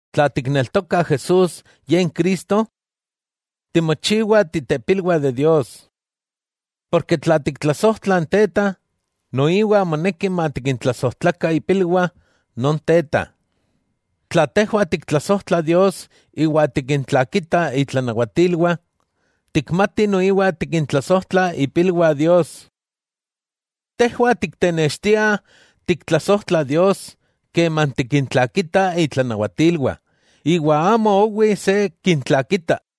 Tla tikneltoka Jesús Ye n Cristo, timochiwah ipilwah Dios. Porke tla tiktlasojtla n Teta, noiwa moneki matikintlasojtlakah ipilwah non Teta. Tla tejwah tiktlasojtlah Dios iwa tikintlakitah itlanawatilwah, tikmatih noiwah tikintlasojtlah ipilwah Dios. Tejwah tiktenextiah tiktlasojtla Dios keman tikintlakitah itlanawatilwah, iwa amo owi se kintlakita.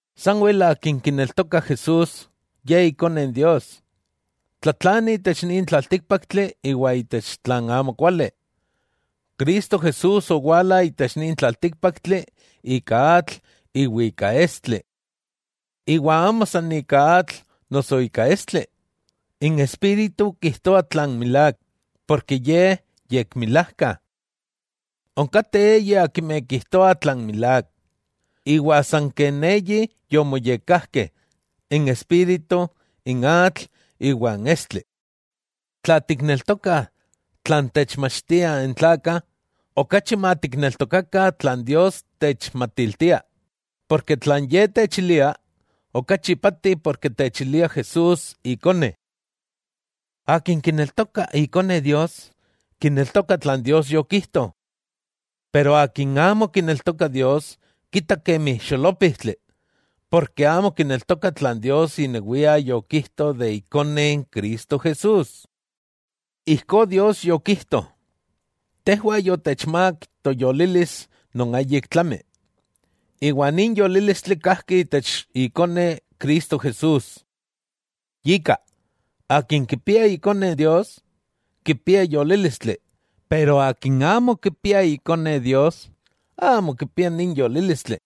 Sanwel akin kineltoka Jesús, Ye Ikone Dios, tlatlani itech nin tlaltíkpaktli iwa itech tlan amokuali. Cristo Jesús owala itech nin tlaltíkpaktli ika atl iwa ika estli. Iwa amo san ika atl noso ika estli. N Espíritu kijtoa tlan milák, porke Ye yekmilajka. Onkateh eyi akimeh kijtoah tlan milák. Iwa san ken eyi yomoyekkajkeh, n Espíritu, n atl iwa n estli. Tla tikneltokah tlan techmatiltiah n tlakah, okachi matikneltokakah tlan Dios techmatiltia, porke tlan Ye techilia, okachi ipati porke techilia Jesús Ikone. Akin kineltoka Ikone Dios, kineltoka tlan Dios yokijto. Pero akin amo kineltoka Dios kita kemi xolópijtli, porke amo kineltoka tlan Dios inewia yokijto de Ikone Cristo Jesús. Ijkó Dios yokijto: tejwah yotechmák toyolilis non ayik tlami, iwa nin yolílistli kajki itech Ikone Cristo Jesús. Yika, akin kipia Ikone Dios, kipia yolílistli, pero akin amo kipia Ikone Dios, amo kipia nin yolílistli.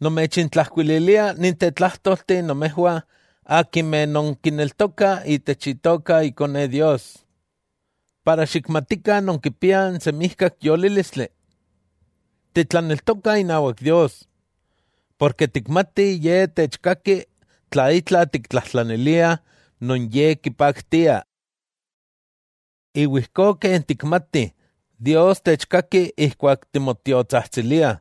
Nomechintlajkuililia ninteh tlájtolteh nomejwah akimeh non kineltokah itech Itoka Ikone Dios, para xikmatikah nonkipiah n semijkak yolílistli. Titlaneltokah inawak Dios, porke tikmatih Ye techkaki tla itla tiktlajtlaniliah non Ye kipaktia. Iwa ijkó ken tikmatih Dios techkaki ijkuak timotiotsajtsiliah,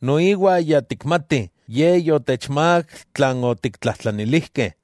noiwa ya tikmatih Ye yotechmák tlan otiktlajtlanilijkeh.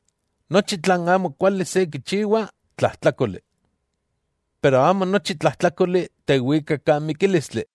Nochi tlan amokuali se kichiwa, tlajtlákoli. Pero amo nochi tlajtlákoli tewika kan mikílistli.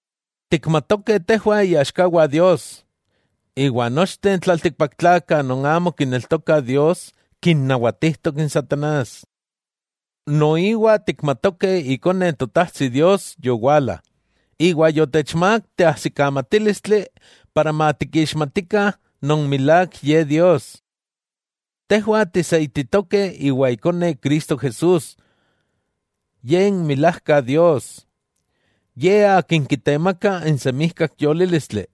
Tikmatokeh tejwah iaxkawah Dios, iwa nochteh n tlaltikpaktlakah non amo kineltokah Dios kinnawatijtok n satanás. Noiwa tikmatokeh Ikone n Totajtsi Dios yowala, iwa yotechmák teajsikamatílistli para matikixmatikah non milák Ye Dios. Tejwah tiseititokeh iwa Ikone Cristo Jesús; Ye n milajka Dios. Ye Akin kitemaka n semijkak yolílistli.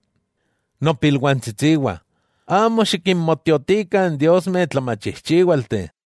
Nopilwantsitsiwah, amo xikinmotiotikah n diosmeh tlachijchíwalteh.